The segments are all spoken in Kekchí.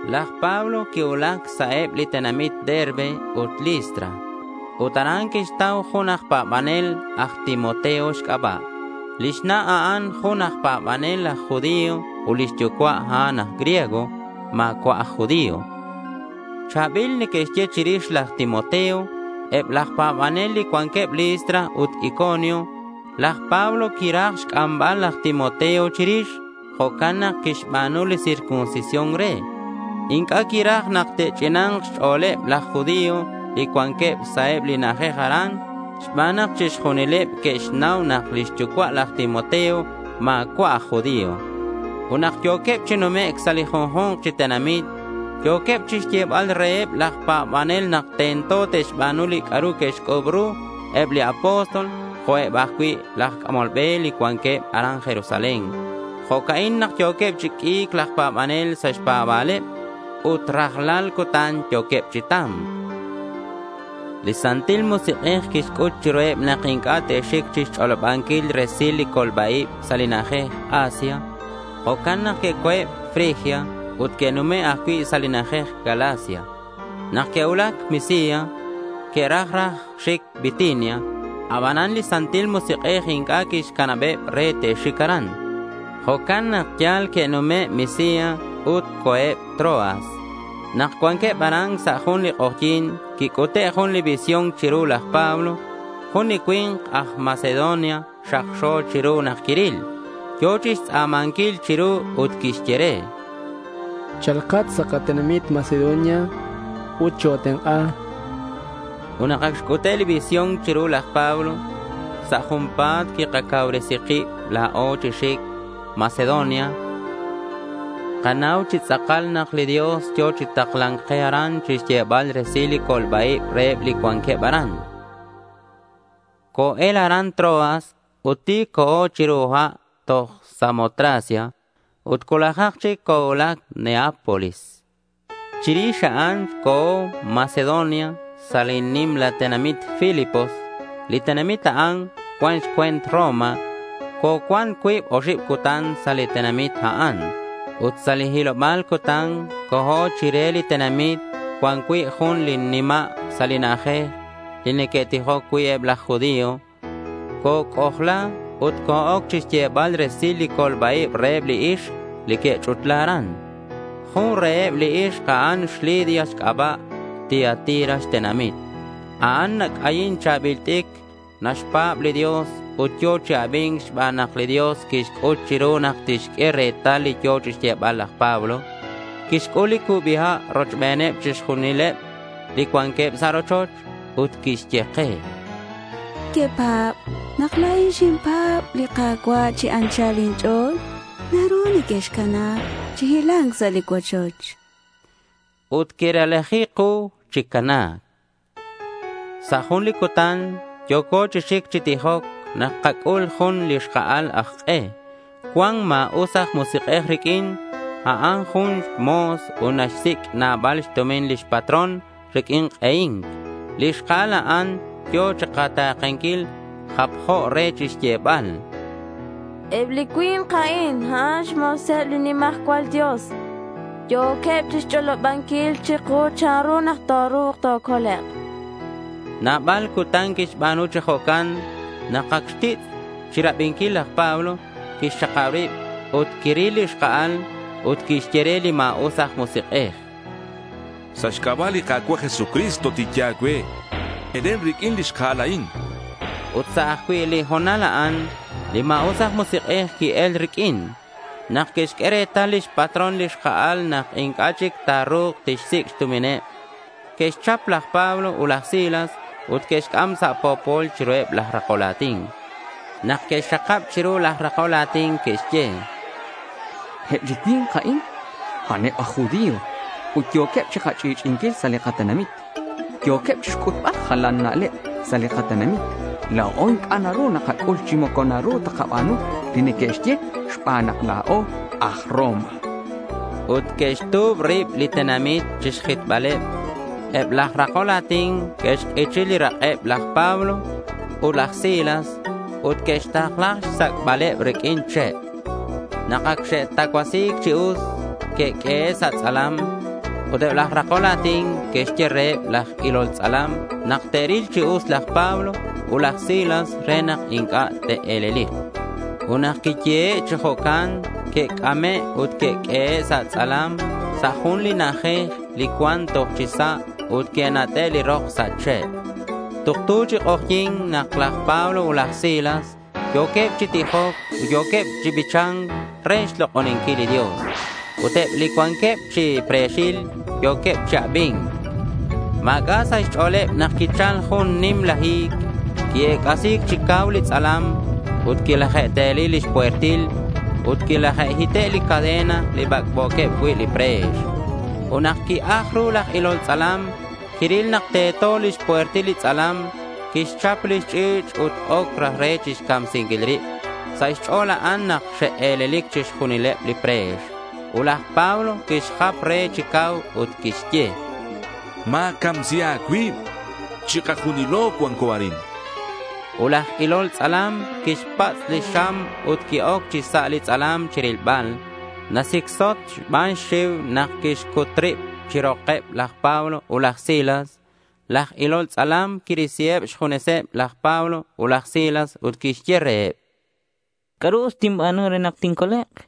Laj Pablo quicuulac sa' eb li tenamit Derbe ut Listra. Ut aran quixtau jun aj pa̱banel aj Timoteo xc'aba'. Lix na', a'an jun aj pa̱banel aj judío ut lix yucua', a'an aj griego. Ma̱cua' aj judío. Cha̱bil neque'xye chirix laj Timoteo eb laj pa̱banel li cuanqueb Listra ut Iconio. Laj Pablo quiraj xc'ambal laj Timoteo chirix. Jo'can nak quixba̱nu li circuncisión re. Inc'a' quiraj nak te'ch'ina̱nk xch'o̱leb laj judío li cuanqueb sa' eb li na'ajej aran xban nak chixjunileb que'xnau nak lix yucua' laj Timoteo ma̱cua' aj judío. Ut nak yo̱queb chi numec' sa' li junju̱nk chi tenamit, yo̱queb chixyebal reheb laj pa̱banel nak tento te'xba̱nu li c'a'ru que'xc'u̱b ru eb li apóstol jo'queb ajcui' laj c'amol be li cuanqueb aran Jerusalén. Jo'ca'in nak yo̱queb chi q'ui̱c laj pa̱banel sa' xpa̱ba̱leb. Ut rajlal cutan yo̱queb chi ta̱mc. Li Santil Musik'ej quixc'ut chiruheb nak inc'a' te'xic chixch'olobanquil resil li colba-ib sa' li na'ajej Asia. Jo'can nak que'co̱eb Frigia ut que'nume' ajcui' sa' li na'ajej Galacia. Nak que'cuulac Misia, que'raj raj xic Bitinia. Abanan li Santil Musik'ej inc'a' quixcanabeb re te'xic aran. Jo'can nak yal que'nume' Misia ut co̱eb Troas. Nak cuanqueb aran sa' jun li k'ojyi̱n quic'ute' jun li visión chiru laj Pablo. Jun li cui̱nk aj Macedonia xakxo chiru nak quiril. Yo̱ chixtz'a̱manquil chiru ut quixye re: —Cha̱lkat sa' katenamit Macedonia ut choa̱tenk'a, chu'ux re nak quiril. Ut nak ac xc'ute' li visión chiru laj Pablo, sa' junpa̱t quikacauresi kib la̱o chi xic Macedonia. Kanau chi tz'akal nak li Dios yo̱ chi takla̱nc ke aran chixyebal resil li colba-ib reheb li cuanqueb aran. Co-el aran Troas ut ti̱c co̱o chiru ha' toj Samotracia. Ut cuulajak chic cocuulac Neápolis. Chirix a'an co̱o Macedonia sa' li nimla tenamit Filipos. Li tenamit a'an cuan xcue̱nt Roma. Cocuan cuib oxib cutan sa' li tenamit a'an. Ut sa' li hiloba̱l cutan co̱o chire li tenamit cuan cui' jun li nima' sa' li na'ajej li neque'tijoc cui' eb laj judío. Coc'ojla ut co-oc chixyebal resil li colba-ib reheb li ixk li que'ch'utla aran. Jun reheb li ixk a'an xLidia xc'aba'. Tiatira xtenamit. A'an nac'ayin cha̱bil t'icr. Naxpa̱b li Dios ut yo̱ chi abi̱nc xban nak li Dios quixc'ut chiru nak tixq'ue retal li yo̱ chixyebal laj Pablo. Quixc'ul li cubi ha' rochbeneb chixjunileb li cuanqueb sa' rochoch, ut quixye ke: —Cui nequepa̱b nak la̱in xinpa̱b li Ka̱cua' chi anchal inch'o̱l, naru nequexcana chi hila̱nc sa' li cuochoch, chan ke. Ut quirelaji ku chi cana̱c. Sa' jun li cutan yo̱co chi xic chi tijoc nak kac'ul jun li xka'al aj k'e. Cuan ma̱us aj musik'ej riq'uin. A'an jun mo̱s ut naxsic' nabal xtumin lix patrón riq'uin k'ehi̱nc. Li xka'al a'an yo̱ chikata̱kenquil. Japjo re chixyebal: —Eb li cui̱nk a'in a'an xmo̱seb li nimajcual Dios. Yo̱queb chixch'olobanquil chiku chanru nak ta̱ru̱k tocolek', chan. Nabal cutan quixba̱nu chi jo'can. Nak ac xtitz' chirabinquil, laj Pablo quixxakab rib, ut quiril li xka'al, ut quixye re li ma̱us aj musik'ej: —Sa' xc'aba' li Ka̱cua' Jesucristo, tinye a̱cue: Elen riq'uin li xka'al a'in, chan. Ut sa' ajcui' li ho̱nal a'an, li ma̱us aj musik'ej qui-el riq'uin. Nak que'xq'ue retal lix patrón li xka'al nak inc'a' chic ta̱ru̱k tixsic' xtumineb, que'xchap laj Pablo ut laj Silas ut que'xc'am sa' po̱pol chiruheb laj rakol a̱tin. Nak que'xxakab chiru laj rakol a̱tin, que'xye: —Eb li cui̱nk a'in, a'aneb aj judío ut yo̱queb chikach'i'ch'i'inquil sa' li katenamit. Yo̱queb chixc'utbal jalan na'leb sa' li katenamit. La̱o inc'a' naru nakac'ul chi moco naru takaba̱nu li neque'xye xban nak la̱o aj Roma, chanqueb. Ut que'xtu̱b rib li tenamit chixjitbaleb. Eb laj rakol a̱tin que'xk'ichi li rak'eb laj Pablo ut laj Silas ut que'xtakla xsac'baleb riq'uin che'. Nak ac xe'tacuasi̱c chi us, que'q'uehe' sa' tz'alam. Ut eb laj rakol a̱tin que'xye reheb laj ilol tz'alam nak te'ril chi us laj Pablo ut laj Silas re nak inc'a' te'e̱lelik. Ut nak quiyehe' chi jo'can, que'c'ame' ut que'q'uehe' sa' tz'alam sa' jun li na'ajej li cuan toj chi sa' ut que'nat'e' li rok sa' che'. Tuktu chic k'ojyi̱n nak laj Pablo ut laj Silas yo̱queb chi tijoc ut yo̱queb chi bicha̱nc re xlok'oninquil li Dios. Ut eb li cuanqueb chi pre̱xil yo̱queb chi abi̱nc. Ma̱c'a' sa' xch'o̱leb nak quichal jun nimla hi̱c. Qui-ec'asi̱c chi cau li tz'alam, ut quilaje'teli lix puertil. Ut quilaje'hite' li cadena li bac'bo̱queb cui' li pre̱x. Ut nak qui-aj ru laj ilol tz'alam, quiril nak teto lix puertil li tz'alam. Quixchap lix ch'i̱ch' ut oc raj re chixcamsinquil rib. Sa' xch'o̱l a'an nak xe'e̱lelic chixjunileb li pre̱x. Ut laj Pablo quixjap re chi cau ut quixye: —Ma̱camsi a̱cuib. Chikajunilo cuanco arin, chan. Ut laj ilol tz'alam quixpatz' lix xam ut qui-oc chi sa' li tz'alam chirilbal. Nasicsot xban xxiu nak quixcut rib chi rokeb laj Pablo ut laj Silas. Laj ilol tz'alam quirisiheb xjuneseb laj Pablo ut laj Silas ut quixye reheb: —¿C'a'ru us tinba̱nu re nak tincolek'?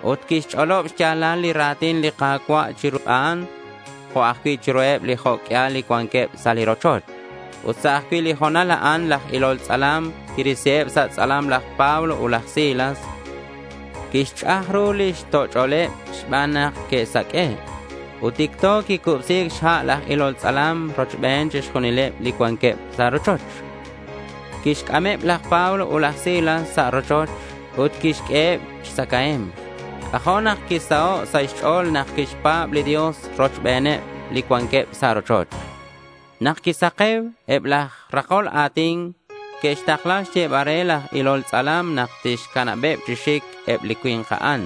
Ut quixch'olob xya̱lal li ra̱tin li Ka̱cua' chiru a'an jo' ajcui' chiruheb li jo' q'uial li cuanqueb sa' li rochoch. Ut sa' ajcui' li ho̱nal a'an laj ilol tz'alam quirisiheb sa' tz'alam laj Pablo ut laj Silas. Quixch'aj ru lix toch'oleb xban nak que'saq'ue'. Ut ticto quicubsi̱c xha' laj ilol tz'alam rochbeneb chixjunileb li cuanqueb sa' li rochoch. Quixc'ameb laj Pablo ut laj Silas sa' rochoch ut quixq'ueheb xtzacae̱mk. C'ajo' nak quisaho' sa' xch'o̱l nak quixpa̱b li Dios rochbeneb li cuanqueb sa' rochoch. Nak quisake̱u, eb laj rakol a̱tin que'xtakla xyebal re laj ilol tz'alam nak tixcanabeb chi xic eb li cui̱nk a'an.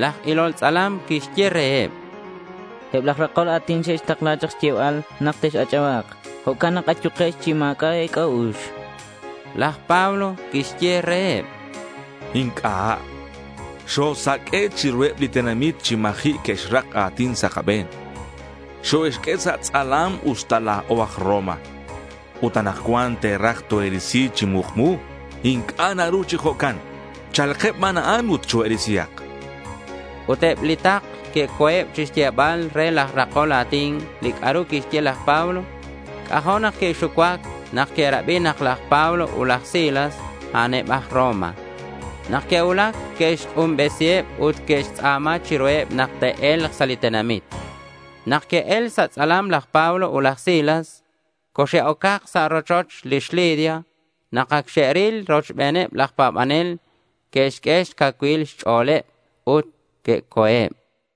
Laj ilol tz'alam quixye reheb: —Eb laj rakol a̱tin xe'xtakla chak xyebal nak tex-ach'aba̱k. Jo'can nak ayukex chi ma̱c'a' e̱c'a'ux, chan. Laj Pablo quixye reheb: —Inc'a'. Xosaq'ue' chiruheb li tenamit chi ma̱ji' que'xrak a̱tin sa' kabe̱n. Xoe'xq'ue sa' tz'alam usta la̱o aj Roma. Ut anakcuan, te'raj toe'risi chi mukmu. Inc'a' naru chi jo'can. Cha̱lkeb ban a'an ut choe'risihak, chan. Ut eb li takl que'co̱eb chixyebal re laj rakol a̱tin li c'a'ru quixye laj Pablo. C'ajo' nak que'xucuac nak que'rabi nak laj Pablo ut laj Silas, a'aneb aj Roma. Nak que'cuulac, que'xk'unbesiheb ut que'xtz'a̱ma chiruheb nak te'e̱lk sa' li tenamit. Nak que'el sa' tz'alam laj Pablo ut laj Silas, coxe'ocak sa' rochoch lix Lidia. Nak ac xe'ril ruheb laj pa̱banel, que'xq'ue xcacuilal xch'o̱leb ut que'co̱eb.